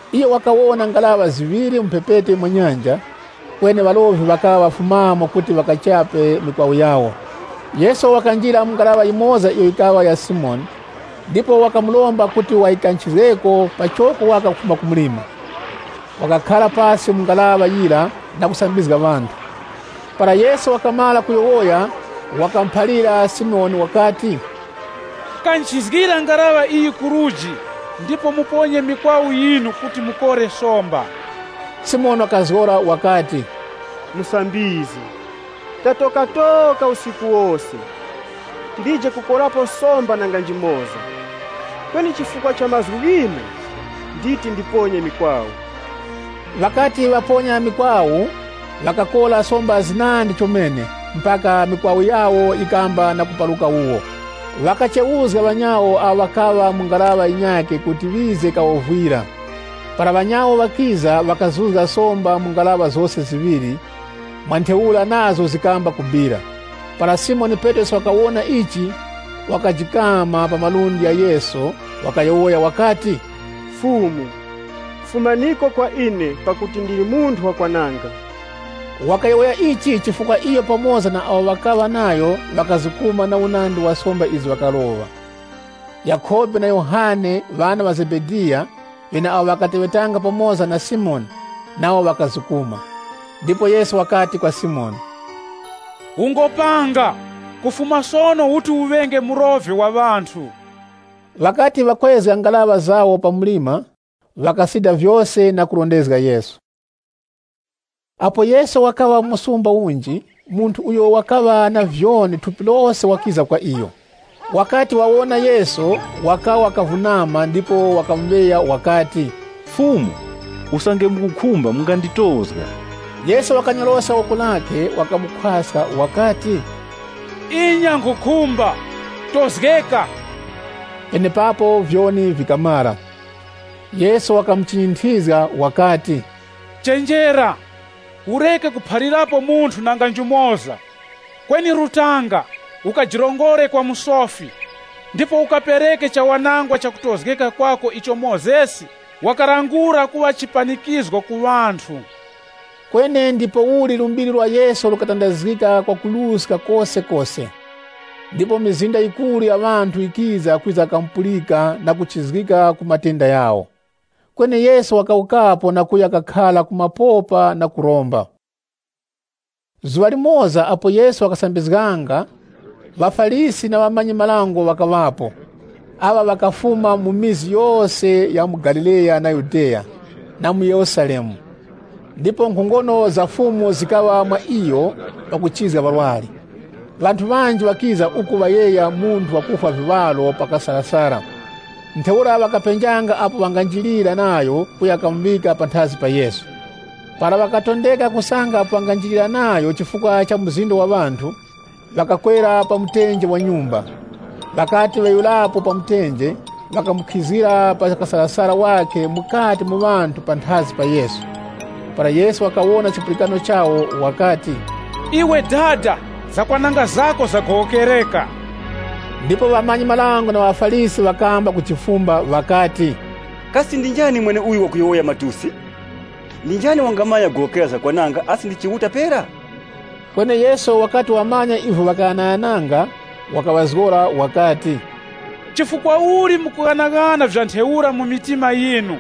Iyo wakawona ngaraŵa ziŵiri mu mphepete mwa nyanja, kweni ŵarovi ŵakaŵa ŵafumamo kuti ŵakachape mikwawu yawo. Yesu wakanjira mu ngaraŵa yimoza iyo yikaŵa ya Simoni, ndipo wakamuromba kuti wayikanchizgeko pachoko waka kufuma ku mlima. Wakakhara pasi mu ngaraŵa yira na kusambizga ŵanthu. Para Yesu wakamara kuyowoya, wakamuphalira Simoni wakati, “Kanchizgira ngaraŵa iyi ku luji ndipo muponye mikwawu yinu kuti mukore somba.” Simoni wakazgora wakati, “Musambizgi, tatokatoka usiku wose. Tilije kukorapo somba nanga njimoza. Kweni chifukwa cha mazgu ghinu, nditi ndiponye mikwawu.” Ŵakati ŵaponya mikwawu, ŵakakora somba zinandi chomene, mpaka mikwawu yawo yikamba na kuparuka wuwo. Ŵakachewuzga ŵanyawo awo ŵakaŵa mu ngaraŵa yinyakhe kuti ŵize kawovwire. Para ŵanyawo ŵakiza, ŵakazuzga somba mu ngaraŵa zose ziŵiri, mwa ntheura nazo zikamba kubira. Para Simoni Petrosi wakawona ichi, wakajikama pa malundi gha Yesu wakayowoya wakati, “Mwe Fumu, fumaniko kwa ine pakuti ndili munthu wakwananga.” Wakayowoya ichi chifukwa iyo pamoza na awo ŵakaŵa nayo ŵakazukuma na unandi wa somba izo ŵakaroŵa. Yakhobe na Yohane, ŵana ŵa Zebediya, ŵeneawo ŵakateŵetanga pamoza na Simoni, nawo ŵakazukuma. Ndipo Yesu wakati kwa Simoni, “Ungopanga, kufuma sono uti uŵenge murovi wa ŵanthu.” Ŵakati ŵakwezga ngaraŵa zawo pa mlima, ŵakasida vyose na kurondezga Yesu. Apo Yesu wakaŵa mu msumba unji, munthu uyo wakaŵa na vyoni thupi lose wakiza kwa iyo. Wakati wawona Yesu, wakawa kavunama ndipo wakamuŵeya wakati, “Fumu, usange mukukhumba, munganditozga.” Yesu wakanyoroska woko lakhe, wakamukhwaska wakati, “Inya, nkhukhumba, tozgeka!” Penepapo vyoni vikamara. Yesu wakamuchinyinthizga wakati, “Chenjera, ureke kuphalirapo munthu nanga njumoza. Kweni rutanga, ukajirongore kwa musofi, ndipo ukapereke chawanangwa chakutozgeka kwako icho Mozesi wakalangula kuŵa chipanikizgo ku ŵanthu.” Kweni ndipouli lumbiri lwa Yesu lukatandazgika kwakuruska kosekose. Ndipo mizinda yikuru ya ŵanthu yikiza kwiza kamupulika na kuchizgika ku matenda ghawo. Kweni Yesu wakawukapo na kuya kakhara ku mapopa na kuromba. Zuŵa limoza apo Yesu wakasambizganga, ŵaFarisi na ŵamanyi-marango, ŵakaŵapo. Aŵa ŵakafuma mu vikaya vyose vya mu Galileya na Yudeya, na mu Yerusalemu. Ndipo nkhongono za Fumu zikaŵa mwa iyo pakuchizga ŵarwari. Ŵanthu ŵanji ŵakiza uku ŵayegha munthu wakufwa viŵaro pa kasarasara. Ntheura ŵakapenjanga apo ŵanganjirira nayo kuya kamuŵika panthazi pa Yesu. Para ŵakatondeka kusanga apo ŵanganjirira nayo chifukwa cha mzinda wa ŵanthu, ŵakakwera pa mtenje wa nyumba. Ŵakati ŵeghurapo pa mtenje, ŵakamukhizgira pa kasarasara wakhe mukati mu ŵanthu panthazi pa Yesu. Para Yesu wakawona chipulikano chawo, wakati, “Iwe dada zakwananga zako zagowokereka.” Ndipo ŵamanyi-marango na ŵaFarisi ŵakamba kujifumba ŵakati, “Kasi ndi njani mweneuyo wakuyowoya matusi? Ndi njani wangamanya kugowokera zakwananga, asi ndi Chiuta pera?” Kweni Yesu wakati wamanya ivyo ŵakaghanaghananga, wakaŵazgora wakati, “Chifukwa uli mukughanaghana vya ntheura mu mitima yinu?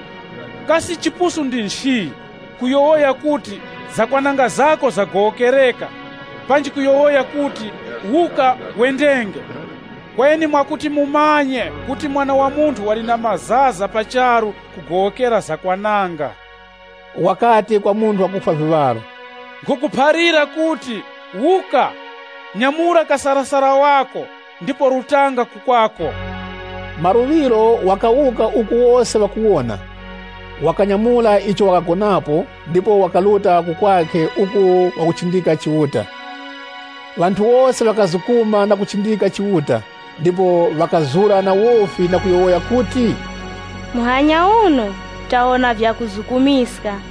Kasi chipusu ndi nchi, kuyowoya kuti, ‘Zakwananga zako zagowokereka,’ panji kuyowoya kuti, ‘Wuka, wendenge?’ Kweni mwakuti mumanye kuti Mwana wa Munthu wali na mazaza pa charu kugowokera zakwananga,” wakati kwa munthu wakufwa viŵaro, “Nkhukuphalira kuti, wuka, nyamura kasarasara wako ndipo rutanga ku kwako.” Maluŵiro wakawuka uku wose ŵakuwona, wakanyamura icho wakagonangapo, ndipo wakaruta ku kwakhe uku wakuchindika Chiuta. Ŵanthu wose ŵakazukuma na kuchindika Chiuta, ndipo ŵakazura na wofi na kuyowoya kuti, “Muhanya uno, tawona vyakuzukumiska.”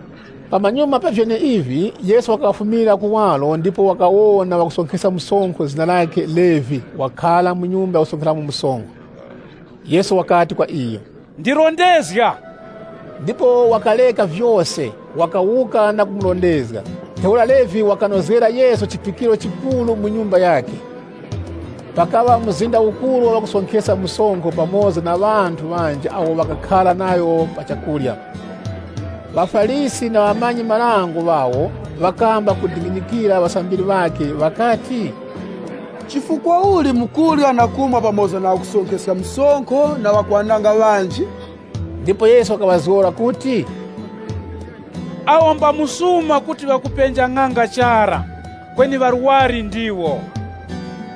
Pamanyuma pa vyeneivi, Yesu wakafumira kuwaro ndipo wakawona wakusonkheska msonkho zina lakhe Levi wakhara mu nyumba yakusonkheramo msonkho. Yesu wakati kwa iyo, “Ndirondezga.” Ndipo wakareka vyose, wakawuka na kumurondezga. Ntheura Levi wakanozgera Yesu chiphikiro chikuru mu nyumba yakhe. Pakaŵa mzinda ukuru wa ŵakusonkheska msonkho pamoza na ŵanthu ŵanji awo ŵakakhara nawo pa chakurya. ŴaFarisi na ŵamanyi-marango ŵawo, ŵakamba kudinginyikira ŵasambiri ŵakhe ŵakati, “Chifukwa uli mukurya na kumwa pamoza na ŵakusonkheska msonkho na ŵakwananga ŵanji?” Ndipo Yesu wakaŵazgora kuti, “Awo mba msuma kuti ŵakupenja ng'anga chara, kweni ŵarwari ndiwo.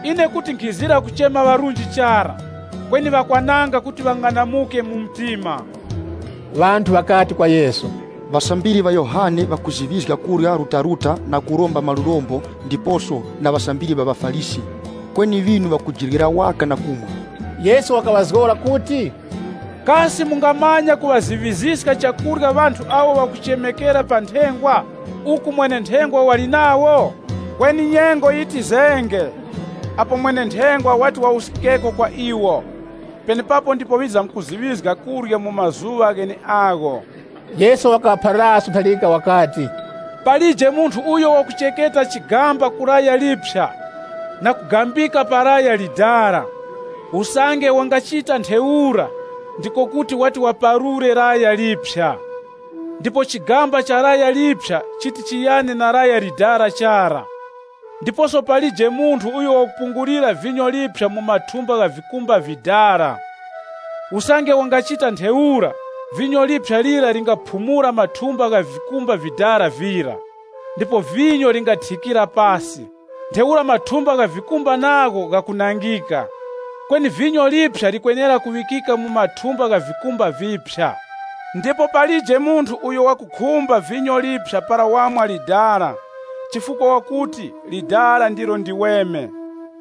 Ine kuti nkhizira kuchema ŵarunji chara, kweni ŵakwananga kuti ŵang'anamuke mu mtima.” Ŵanthu ŵakati kwa Yesu, “Ŵasambiri ŵa Yohane ŵakuziŵizga kurya rutaruta na kuromba malurombo ndiposo na ŵasambiri ŵa ŵaFarisi, kweni ŵinu ŵakujiryera waka na kumwa.” Yesu wakaŵazgora kuti, “Kasi mungamanya kuŵaziŵiziska chakurya ŵanthu awo ŵakuchemekera pa nthengwa, uku mwene-nthengwa wali nawo? Kweni nyengo yitizenge apo mwene-nthengwa wati wawuskikeko kwa iwo. Penepapo ndipo ŵizamkuziŵizga kurya mu mazuŵa gheneagho.” Yesu wakaŵaphaliraso ntharika wakati, “Palije munthu uyo wakuchekera chigamba ku laya liphya na kugambika pa laya likoroŵere. Usange wangachita ntheura, ndiko kuti wati waparure laya liphya. Ndipo chigamba cha laya liphya chiti chiyane na laya likoroŵere chara. Ndiposo palije munthu uyo wakupungulira vinyo liphya mu mathumba gha vikumba vidala. Usange wangachita ntheura, vinyo liphya lira lingaphumula mathumba gha vikumba vidala vira, ndipo vinyo lingathikira pasi. Ntheura mathumba gha vikumba nagho ghakunangika. Kweni vinyo liphya likwenera kuŵikika mu mathumba gha vikumba viphya. Ndipo palije munthu uyo wakukhumba vinyo liphya para wamwa likoroŵere, chifukwa wakuti, ‘Lidala ndilo ndiweme.’”